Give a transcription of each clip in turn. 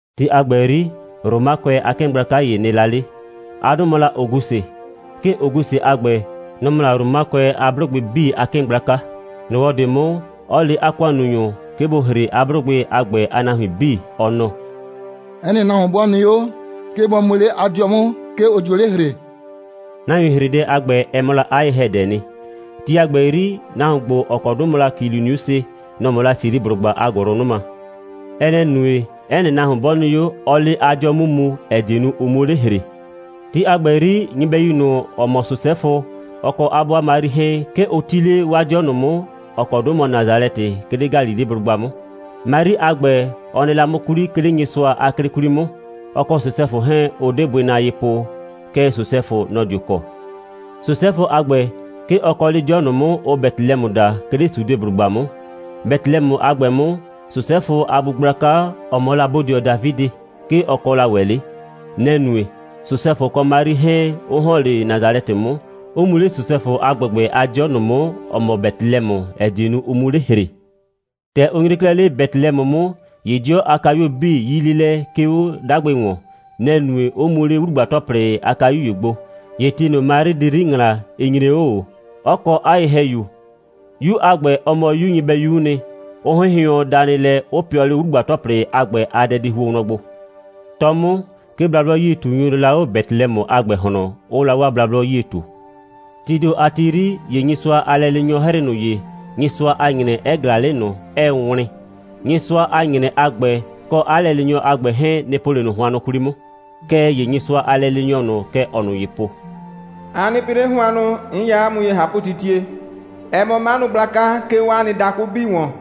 Ti a ‑gbɛ 'yri, Romakʋɛ a 'kɩɩn gblaka ‑ye nɩ la 'le. 'A 'dʋ mɔ la Ogusɩ. 'Kɩɩn Ogusɩ a ‑gbɛ, nɔ‑ mɔ la Romakʋɛ a 'blʋgbɩ 'bii a 'kɩɩn gblaka. ‑Nyrɔwɔ ꞊de 'mʋ, 'ɔ le 'a ‑kʋannunyʋ, 'ke bʋ ‑hre 'a 'blʋgbɩ a ‑gbɛ a nahuin 'bii, ɔ nɔ: «'Ɛ nɩ nahuon 'bɔ nɩ 'o, 'ke bɔ mu 'le 'a 'dɩɔ 'mʋ, 'ke ʋ dio 'le ‑hree!» Nahuin‑hredɛ a ‑gbɛ, ɛ mɔ la 'a ye‑hɛdɛɛ nɩ. Ti a ‑gbɛ 'yri, nahuon ‑gbo, ‑ɔ kɔ 'dʋ mɔ la Kiliniusɩ, nɔ‑ mɔ la Siliblʋgba a ‑gʋlʋnʋma. Ɛ nɛ‑ nue, 'ɛ nɩ nahuon 'bɔ nɩ 'o, 'ɔɔ 'le 'a 'dɩɔ 'mʋ mu, ‑ɛ die nu, ʋ 'muo 'le ‑hree. Ti a ‑gbɛ 'yri, nyɩbɛyu ꞊nʋ, ‑ɔ mɔ Sosɛfʋ, ɔ kɔ 'a 'bʋa Mari 'hɛɛn, 'ke ʋ 'ti 'le 'waa 'dɩɔ ꞊nʋ 'mʋ, ‑ɔ kɔ 'dʋ mɔ Nasalɛtɩ, 'ke 'le Galileblʋgba 'mʋ. Mari a ‑gbɛ, ɔ nɩ la 'mʋ 'kwli, 'ke 'le Nyɩsʋa a 'klɩ 'kwli 'mʋ. Ɔ kɔ Sosɛfʋ 'hɛɛn, ʋ 'de bʋɩ na ye po. Kɛɛ, Sosɛfʋ, nɔ‑ dio kɔ. Sosɛfʋ a ‑gbɛ, 'ke ɔ kɔ 'le 'dɩɔ ꞊nʋ 'mʋ, ʋʋ Betelɛmʋ daa, 'ke 'le Sudeblʋgba 'mʋ. Betelɛmʋ a ‑gbɛ 'mʋ, Sosɛfʋ a bu gblaka, ‑ɔ mɔ la bodɩɔ Dafidɩ, 'ke ɔ kɔ la ‑wɛ 'le. Nɛ‑ nue, Sosɛfʋ kɔ Mari 'hɛɛn 'ʋ ‑hɔn 'le Nasalɛtɩ 'mʋ, 'ʋ mu 'le Sosɛfʋ a ‑gbɛgbɛ a 'dɩɔ ꞊nʋ 'mʋ, ‑ɔ mɔ Betelɛmʋ, ‑ɛ die nu, ʋ 'mu 'le ‑hree. ‑Tɛ ʋ nyre 'klɛɛ 'le Betelɛmʋ 'mʋ, ‑ye 'dɩɔ a kayuo 'bii 'yii 'le lɛ, 'ke 'o 'dagbɩ ‑wɔn. Nɛ‑ nue, 'ʋ mu 'le 'wlugba‑tɔplɩ a kayu ‑ye gbo. ‑Ye ti ꞊nʋ, Mari di 'yri ‑ŋlaa, ɩ nyre 'o ꞊o, 'ɔ kɔ 'a ye‑hɛyu. 'Yu a ‑gbɛ, ɔ mɔ 'yu nyɩbɛyu'u nɩ, 'ɔ 'hɩnhɩʋɔn danɩ lɛ, 'ɔ pɩɔ 'le 'wlugba‑tɔplɩ a ‑gbɛ a dɛdihuo wlɔn gbo. 'Tɔ 'mʋ, 'ke blablɔ'yie꞊tunyʋ nɩ la 'o Betelɛmʋ a ‑gbɛ ꞊hlɔn, 'ʋʋ la 'waa blablɔ 'yie ꞊tu. Tii ‑do a ti 'yri, ‑ye Nyɩsʋa a lɛleenyɔ 'hrɩɩ ꞊nʋ ye, Nyɩsʋa a ‑nyrɛ 'ɛ ꞊glaa 'le ꞊nʋ, 'ɛɛ wlɩn. Nyɩsʋa a ‑nyrɛ a ‑gbɛ kɔ 'a lɛleenyɔ a ‑gbɛ 'hɛɛn, nɩ‑ po 'le ꞊nʋ hʋannʋ 'kwli 'mʋ. Kɛɛ ‑ye Nyɩsʋa a lɛleenyɔ ꞊nʋ, kɛ ɔɔ ꞊nʋ ye po: «A nɩ pɩ 'le hʋannʋ. 'N ya 'a mʋ ye ꞊hapʋtitie. Ɛ mɔ 'manʋ gblaka, 'ke 'o 'a nɩ dakʋ 'bii ‑wɔn.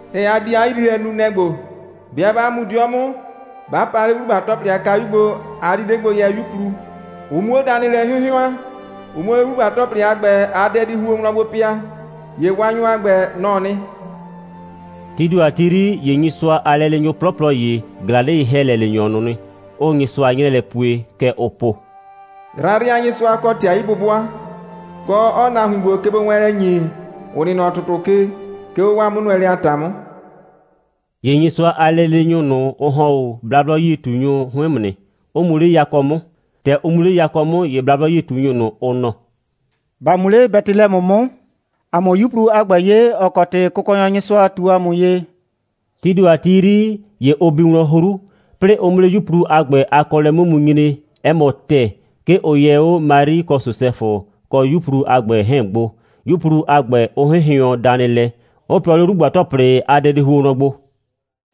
‑Tɛ a di 'a yriilɛ nu, nɛ‑ ‑gbo: 'Bɩa 'ba mu 'dɩɔ 'mʋ, 'ba pa 'le 'wlugba‑tɔplɩ a kayu gbo, a di 'le gbo yɛ 'yuplu, ʋ 'muo danɩ lɛ 'hɩnhɩʋan, ʋ 'muo 'le 'wlugba‑tɔplɩ a ‑gbɛ a dɛdihuo wlɔn gbo pɩa. ‑Ye Waanyɔ a ‑gbɛ, nɔ‑ɔ nɩ.» Tii ‑do a ti 'yri, ‑ye Nyɩsʋa a lɛleenyʋ 'plɔplɔ ‑ye ꞊glaa 'le ye‑hɛlɛleenyɔ ꞊nʋ nɩ, 'ʋʋ Nyɩsʋa 'nyrɛɛ lɛ pue. Kɛ ʋʋ po: «Yrayrɩnyɩsʋa kɔ ‑tɩ a 'yi'bʋbʋa, kɔ, 'ɔɔ nahuin ‑gbo kegbowɛɛnlɛ ‑nye, ‑ʋ nɩ nɔ ‑tʋtʋ ke, 'ke 'o 'waa 'mʋnʋɛlɛ a ‑ta 'mʋ.» ‑Ye Nyɩsʋa a lɛleenyʋ ꞊nʋ, ʋ ‑hɔn 'o blablɔ'yie꞊tunyʋ 'hʋɩn 'mʋ nɩ, 'ʋ mu 'le yakɔ 'mʋ. ‑Tɛ ʋ mu 'le yakɔ 'mʋ, ‑ye blablɔ'yie꞊tunyʋ ꞊nʋ, ʋ nɔ: «‑Ba mu 'le Betelɛmʋ 'mʋ, ‑a 'mʋ 'yuplu a ‑gbɛ 'ye, ‑ɔ kɔ ‑tɩ Kʋkɔnyɔ Nyɩsʋa ꞊tu ‑a mʋ ye.» Tii ‑do a ti 'yri, ‑ye ʋ bi wlɔn 'hru. 'Plɩɩ ʋ 'mʋ 'le 'yuplu a ‑gbɛ a kɔɔlɛ 'mʋ mu nyre, 'ɛ mɔ ‑tɛɛ, 'ke ʋ yɛ 'o Mari kɔ Sosɛfʋ kɔ 'yuplu a ‑gbɛ 'hɛɛn gbo, 'yuplu a ‑gbɛ, 'ʋ 'hɩnhɩʋɔn danɩ lɛ, 'ʋ pɩɔ 'le 'wlugba‑tɔplɩ a dɛdihuo wlɔn gbo.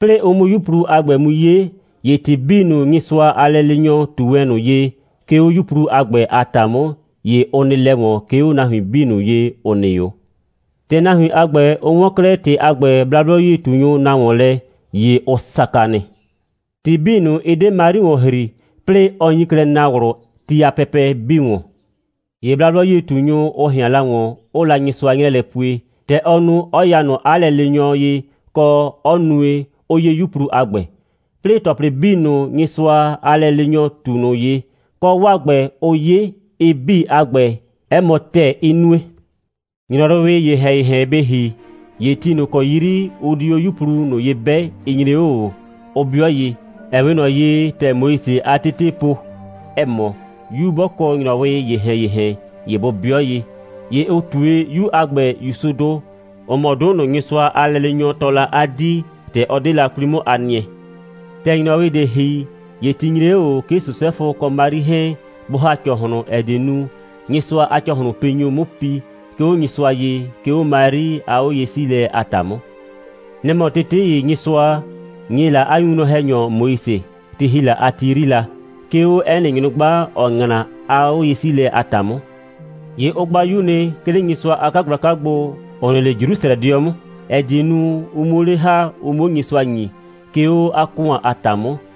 'Plɩɩ ʋ 'mʋ 'yuplu a ‑gbɛ mu 'ye, ‑ye ‑tɩ 'bii ꞊nʋ, Nyɩsʋa a lɛleenyɔ ꞊tu wɛn ꞊nʋ ye, 'ke 'o 'yuplu a ‑gbɛ a ‑ta 'mʋ, ‑ye ʋ nɩ lɛ ‑wɔn, 'ke 'o nahuin 'bii ꞊nʋ ye, ‑ʋ nɩ 'o. ‑Tɛ nahuin a ‑gbɛ, ʋ 'wɔn 'klɛɛ ‑tɩ a ‑gbɛ, blablɔ'yie꞊tunyʋ na ‑wɔn lɛ, ‑ye ʋ saka nɩ. ‑Tɩ 'bii ꞊nʋ, ɩ 'de Mari ‑wɔn ‑hri, 'plɩɩ ɔ nyi klɛ naa ꞊wlʋ ti a pɛpɛ 'bii ‑wɔn. ‑Ye blablɔ'yie꞊tunyʋ, ʋ ꞊hɩan la ‑wɔn, 'ʋʋ la Nyɩsʋa 'nyrɛɛ lɛ pue, ‑tɛ ɔ nu, 'ɔ ya ꞊nʋ 'a lɛleenyɔ ye, kɔ, 'ɔ nue, 'ʋ 'ye 'yuplu a ‑gbɛ. 'Plɩɩ ‑tɔplɩ 'bii ꞊nʋ, Nyɩsʋa a lɛleenyɔ ꞊tu ꞊nʋ ye, kɔ 'waa ‑gbɛ, ʋ 'ye, ɩ 'bii a ‑gbɛ, 'ɛ mɔ ‑tɛɛ, 'ɩ nue. ‑Nyrɔwɩɩ ‑yehɛn‑yehɛn bɩ ‑hi, ‑ye ti ꞊nʋ ‑kɔ 'yri ʋ di 'o 'yuplu ꞊nʋ ye 'bɛ, ɩ nyre 'o ꞊o, 'ʋ 'bɩɔ ye, ‑ɛ 'we ꞊nɔ ye, ‑tɛ Moise a tetee po, ‑ɛ mɔ, 'yu 'bɔ kɔ ‑nyrɔwɩɩ ‑yehɛn‑yehɛn, ‑ye bʋ 'bɩɔ ye. ‑Ye ʋ ꞊tue 'yu a ‑gbɛ ‑Yusudʋ, ‑ʋ mɔ 'dʋ ꞊nʋ, Nyɩsʋa a lɛleenyɔ tɔɔ la 'a 'dii, ‑tɛ ɔ 'de la 'kwli 'mʋ a nɩɛ. ‑Tɛ ‑nyrɔwɩ ꞊de ‑hi, ‑ye ti nyre 'o ꞊o, 'ke Sosɛfʋ kɔ Mari 'hɛɛn bʋ ‑ha ‑cɔhlʋn, ‑ɛ die nu, Nyɩsʋa a ‑cɔhlʋnpinyʋ 'mu pi, 'ke 'o Nyɩsʋa ye, 'ke 'o Mari a 'oye'siilɛ a ‑ta 'mʋ. Nɛ‑ mɔ tete ‑ye, Nyɩsʋa ‑nye la 'a winwlɔn‑hɛnyɔ Moise, ti ‑hi la a ti 'yri la, 'ke 'o 'ɛ nɩ nyrʋgba, ‑ɔ ‑ŋla, a 'oye'siilɛ a ‑ta 'mʋ. ‑Ye ʋ gba 'yu nɩ, 'ke 'le Nyɩsʋa a 'kagblaka gbo, ‑ʋ nɩ 'le Jrusrɛdɩɔ 'mʋ, ‑ɛ die nu, ʋ 'muo 'le ‑ha, ʋ 'muo Nyɩsʋa ‑nyi, 'ke 'o 'a ‑kʋan a ‑ta 'mʋ,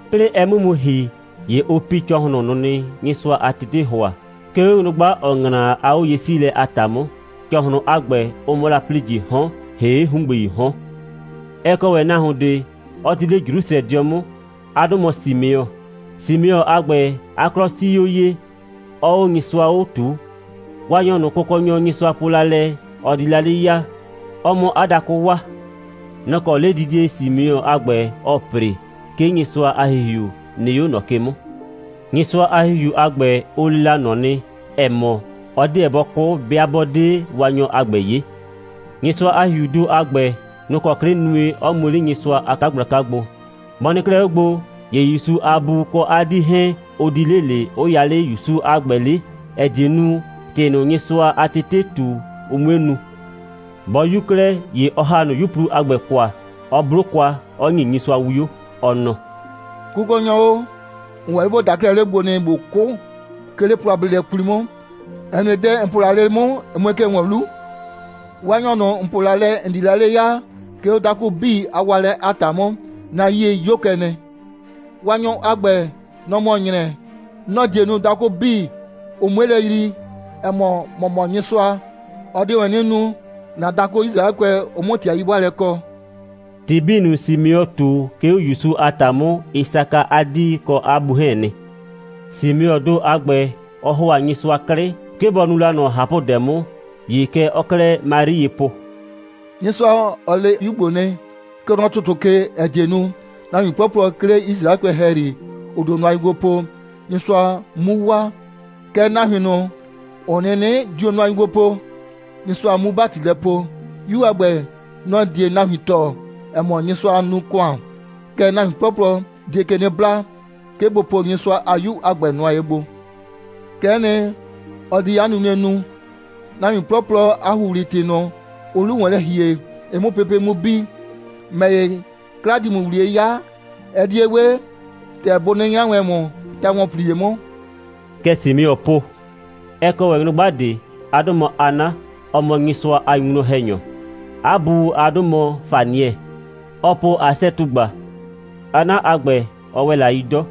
'Plɩɩ ɛ 'mʋ mu ‑hi, ‑ye ʋ pi ‑cɔhlʋn ꞊nʋ nɩ, Nyɩsʋa a tetee ‑hʋa, 'ke 'o nyrʋgba, ‑ɔ ‑ŋla a 'oye'siilɛ a ‑ta 'mʋ. ‑Cɔhlʋndʋ a ‑gbɛ, ʋ mɔ la ‑plijɩɩ 'hɔn, ‑hee' ‑hungbeii 'hɔn. Ɛ kɔ ‑wɛ nahuon ꞊de, 'ɔ 'ti 'le Jrusrɛdɩɔ 'mʋ. 'A 'dʋ mɔ Simeɔ. Simeɔ a ‑gbɛ, 'a 'klɔ 'sii 'o ye, 'ɔɔ 'o Nyɩsʋa 'o ꞊tuu. Waanyɔ ꞊nʋ, Kʋkɔnyɔ Nyɩsʋa po la lɛ, ɔ di la 'le ya, ɔ 'mʋ 'a dakʋ waa, nɔ‑ kɔ 'ledidie Simeɔ a ‑gbɛ, ɔɔ ‑pre. 'Ke Nyɩsʋa a ‑Hihiu nɩ 'o ꞊nɔ ke 'mʋ. Nyɩsʋa a ‑Hihiu a ‑gbɛ, ʋ le la ꞊nɔ nɩ, ‑ɛ mɔ, ɔ 'deɛ bɔ 'kʋ, 'bɩa 'bɔ 'de Waanyɔ a ‑gbɛ 'ye. Nyɩsʋa a ‑Hihiuu ‑do a ‑gbɛ, nʋ‑ kɔ 'klɩ nue, 'ɔ mu 'le Nyɩsʋa a 'kagblaka gbo. Bɔ nɩ 'klɛɛ 'o gbo, ‑ye ‑Yusu a bu kɔ 'a 'dii 'hɛɛn, ʋ di 'le ꞊le, 'ʋ ya 'le ‑Yusu a ‑gbɛ 'le, ‑ɛ die nu, ‑tɩ ꞊nʋ, Nyɩsʋa a tetee ꞊tu, ʋ 'mue nu. Bɔ 'yu 'klɛɛ, ‑ye ɔ ‑ha ꞊nʋ 'yuplu a ‑gbɛ kwa, 'ɔ 'blo kwa, 'ɔ ‑nyi Nyɩsʋa 'wio, ɔ nɔ: «Kʋkɔnyɔ o, ‑n ‑wɛ 'le ‑bo daa 'klɛɛ 'le 'mʋ gbo nɩ, ꞊bo 'kʋ, 'ke 'le plɔ a bleelɛ 'kwli 'mʋ, ‑ɛ nue, dɛ ‑n po la 'le 'mʋ, ɛ mue kɛ ‑wɔn 'lu. Waanyɔ ꞊nʋ, ‑n po la lɛ, ‑n di 'le ya, 'ke 'o dakʋ 'bii a waalɛ a ‑ta 'mʋ, 'na 'yie 'yo kɛ nɩ. Waanyɔ a ‑gbɛ, nɔ‑ mɔ ‑nyrɛ. Nɔ‑ die nu, dakʋ 'bii, ʋ 'mue lɛ yrii, ‑ɛ mɔ, ‑mɔ mɔ Nyɩsʋa. Ɔ die ‑wɛ 'nɩ nu, ‑na dakʋ Yisraɛkʋɛ, ʋ 'mʋ ‑tɩ a 'yi'bʋaalɛ kɔ.» ‑Tɩ 'bii ꞊nʋ, Simeɔ ꞊tu, 'ke 'o ‑Yusu a ‑ta 'mʋ, ɩ saka 'a 'dii kɔ 'a bu 'hɛɛn nɩ. Simeɔɔ ‑do a ‑gbɛ, ɔ ‑hʋa Nyɩsʋa 'klɩ, 'ke bɔ nu la ꞊nɔ ꞊hapʋdɛ 'mʋ. ‑Ye kɛ ɔɔ 'klɛɛ Mari ye po: «Nyɩsʋa, ɔ le 'yu ‑gbo nɩ, kɛ nɔ ‑tʋtʋ ke, ‑ɛ die nu, nahuin 'plɔplɔ, 'ke 'le Yisraɛkʋɛ ‑hɛyri, ‑ʋ dio nʋa ye gbo po, Nyɩsʋa 'mu waa, kɛɛ, nahuin ꞊nʋ, ‑ʋ 'nɩnɩ dio nʋa ye gbo po, Nyɩsʋa 'mu ‑bati lɛ poo. 'Yu a ‑gbɛ, nɔ‑ die nahuin tɔɔ, ‑ɛ mɔ, Nyɩsʋaa nu ‑kʋan, kɛɛ, nahuin 'plɔplɔ die ke 'nɩ bla, 'ke bʋ po Nyɩsʋa a 'Yu a ‑gbɛ nʋa ye gbo. Kɛ'ɛ nɩ, ɔ di 'a nunue nu, nahuin 'plɔplɔ a ‑huhli‑tɩ ꞊nʋ, ʋʋ 'lu ‑wɔn lɛ ‑hie, ɩ 'mʋ pepe' 'mʋ bi. ‑Mɛ ‑ye, 'kla ‑di ‑mʋ ‑wliye 'ya, ɛ di ye 'we ‑tɛ bʋ 'nɩnɩ 'nyra wɛn ‑mʋ ta‑wɔnplie 'mʋ.» Kɛ Simeɔ po. Ɛ kɔ ‑wɛ nyrʋgba ꞊de. 'A 'dʋ mɔ Hana. Ɔ mɔ Nyɩsʋa a winwlɔn‑hɛnyɔ. 'A bu a 'dʋ mɔ Fanɩɛ. Ɔɔ po Asɛ꞊tugba. Hana a ‑gbɛ, ɔ ‑wɛ la 'yi 'dɔ.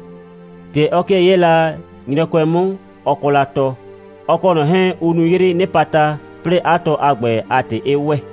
‑Tɛ ɔ 'kɩɛ 'yɛɛ la nyrɔkʋɛ 'mʋ, ɔ kɔ la tɔ. Ɔ kɔ ꞊nɔ 'hɛɛn, ʋ nu 'yrɩɩ 'nɩpata, 'plɩɩ 'a tɔ a ‑gbɛ a ‑tɩ 'ɩ ‑wɛ.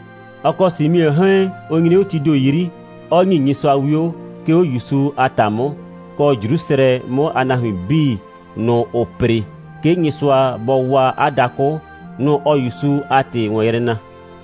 Ɔ kɔ Simeɔ 'hɛɛn, ʋ nyre 'o tii ‑do 'yri, 'ɔ ‑nyi Nyɩsʋa 'wio, 'ke 'o ‑Yusu a ‑ta 'mʋ, kɔ, Jrusrɛ 'mʋ a nahuin 'bii ꞊nʋ, ‑ʋʋ ‑pre, 'ke Nyɩsʋa bɔ waa 'a dakʋ, nʋ‑ ɔɔ ‑Yusu a ‑tɩ ‑wɔn yrɛ na.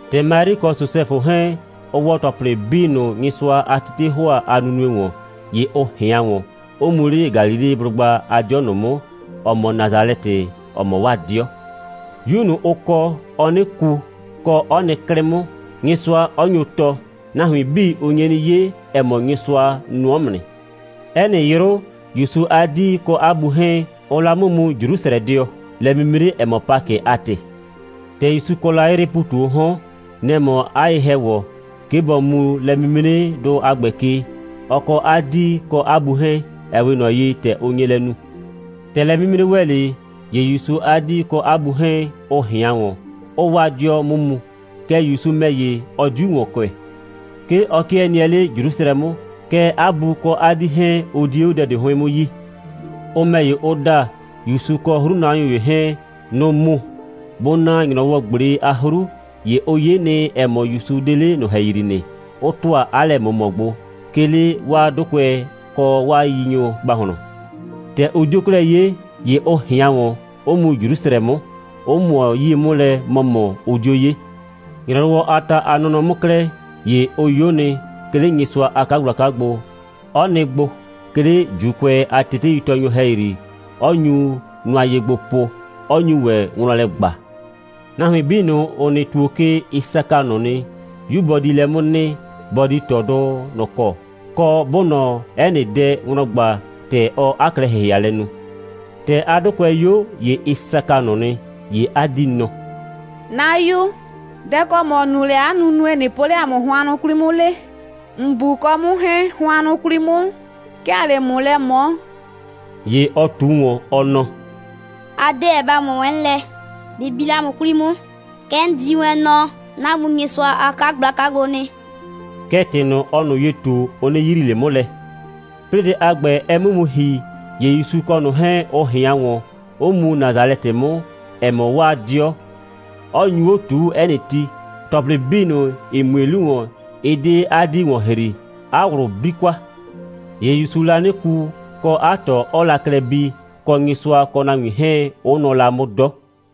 ‑Tɛ Mari kɔ Sosɛfʋ 'hɛɛn, ʋ ‑wɔ ‑tɔplɩ 'bii ꞊nʋ, Nyɩsʋa a tetee ‑hʋa a nunue ‑wɔn, ‑ye ʋ ꞊hɩan ‑wɔn, 'ʋ mu 'le Galileblʋgba a 'dɩɔ ꞊nʋ 'mʋ, ‑ɔ mɔ Nasalɛtɩ, ‑ɔ mɔ 'waa 'dɩɔ. 'Yu ꞊nʋ, ʋ kɔ, ɔɔ 'nɩ ku, kɔ, 'ɔ nɩ 'klɩ 'mʋ, Nyɩsʋa 'ɔ ‑nyo ꞊tɔ. Nahuin 'bii, ʋ nye 'nɩ 'ye, ‑ɛ mɔ, Nyɩsʋa nʋɔ 'mʋ nɩ. 'Ɛ nɩ 'yrʋ, ‑Yusu a 'dii kɔ 'a bu 'hɛɛn, ʋʋ la 'mʋ mu Jrusrɛdɩɔ, lɛ'mimre, ‑ɛ mɔ Pakɩ a ‑tɩ. ‑Tɛ ‑Yusu kɔ la 'yrɩɩ ‑pu ꞊tu 'o 'hɔn, nɛ‑ mɔ 'a ye‑hɛwɔ, 'ke bɔ mu lɛ'mimredʋ a ‑gbɛ ke, ɔ kɔ 'a 'dii kɔ 'a bu 'hɛɛn, ‑ɛ 'we ꞊nɔ ye, ‑tɛ ʋ nye lɛ nu. ‑Tɛ lɛ'mimre ‑wɛ 'le, ‑ye ‑Yusu a 'dii kɔ 'a bu 'hɛɛn, ʋ ꞊hɩan ‑wɔn, 'ʋʋ 'waa 'dɩɔ 'mʋ mu. Kɛɛ, ‑Yusu ‑mɛ ‑ye, ɔ 'diu ‑wɔn kʋɛ. 'Ke ɔ 'kɩɛ nɩɛ 'le Jrusrɛ 'mʋ. Kɛɛ, 'a bu kɔ 'a 'dii 'hɛɛn, ʋ 'die 'o dɛ ꞊de 'hʋɩn 'mʋ yi. Ʋ ‑mɛ ‑ye, ʋ da, ‑Yusu kɔ 'hrunanyʋ ‑ye 'hɛɛn, nʋ‑ʋ mu. Bʋ na ‑nyrɔwɔ꞊gble a 'hru, ‑ye ʋ 'ye nɩ, ‑ɛ mɔ, ‑Yusu 'de 'le ꞊nʋ ‑hɛyri nɩ, 'ʋ ‑tʋa 'a lɛ꞊mʋmɔ gbo, 'ke 'le 'waa 'dʋkʋɛ kɔ 'waa yiyinyʋ ‑gbahlɔn. ‑Tɛ ʋ 'dio 'klɛɛ 'ye, ‑ye ʋ ꞊hɩan ‑wɔn, 'ʋ mu Jrusrɛ 'mʋ, 'ʋ ꞊mʋɔ 'yie 'mʋ lɛ ‑mɔmɔ, 'ʋ 'dio 'ye. ‑Nyrɔwɔ a ta a nɔnɔ 'mʋ 'klɛɛ, ‑ye ʋ 'yo nɩ, 'ke 'le Nyɩsʋa a 'kagblaka gbo, 'ɔ nɩ gbo, 'ke 'le ‑Juukʋɛ a teteitɔɔnyʋ ‑hɛyri, 'ɔ nyu nʋa ye gbo po, 'ɔ nyu ‑wɛ wlɔn lɛ ꞊gba. Nahuin 'bii ꞊nʋ, ‑ʋ nɩ ‑tuo ke, ɩ saka ꞊nʋ nɩ, 'yu bɔ di lɛ 'mʋ nɩ, bɔ di ꞊tɔdʋ ꞊nʋ kɔ, kɔ, 'bʋʋ ꞊nɔ 'ɛ nɩ dɛ wlɔn ꞊gba, ‑tɛ ɔɔ 'a klɛ‑hɩhɩalɛ nu. ‑Tɛ 'a 'dʋkʋɛ 'yo, ‑ye ɩ saka ꞊nʋ nɩ, ‑ye 'a 'dii nɔ: «'Na 'yu, dɛ‑ kɔ ‑mɔ nu lɛ 'a nunue, ꞊nɩ po 'le ‑a mʋ hʋannʋ 'kwli 'mʋ 'le? ‑N bu kɔ 'mʋ 'hɛɛn, hʋannʋ 'kwli 'mʋ, 'ke ‑aa 'le ‑mʋ lɛ ꞊mɔɔ.» ‑Ye ɔ ꞊tu ‑wɔn, ɔ nɔ: «A 'deɛ ba ꞊mɔ wɛn 'mʋ lɛ. Bɩ bi 'le 'a mʋ 'kwli 'mʋ, kɛ 'n di wɛn nɔ 'na Bu Nyɩsʋa a 'kagblaka gbo nɩ.» Kɛɛ, ‑tɩ ꞊nʋ, ɔɔ ꞊nʋ ye ꞊tu, ʋ 'nɩ yrii ꞊le 'mʋ lɛ. 'Plɩɩ dɛ a ‑gbɛ, ɛ 'mʋ mu ‑hi, ‑ye ‑Yusu kɔ ꞊nʋ 'hɛɛn, ʋ ꞊hɩan ‑wɔn, 'ʋ mu Nasalɛtɩ 'mʋ, ‑ɛ mɔ 'waa 'dɩɔ, 'ɔ nyu 'o ꞊tuu 'ɛ nɩ ti. ‑Tɔplɩ 'bii ꞊nʋ, ‑ɩ mue 'lu ‑wɔn, ɩ 'de 'a 'dii ‑wɔn ‑hri. 'A ꞊wlʋ 'bli kwa. ‑Ye ‑Yusuu la 'nɩ ku, kɔ, 'a ꞊tɔ 'ɔɔ la klɛ bii, kɔ, Nyɩsʋa kɔ nahuin 'hɛɛn, 'ʋ nʋɔ la 'mʋ 'dɔ.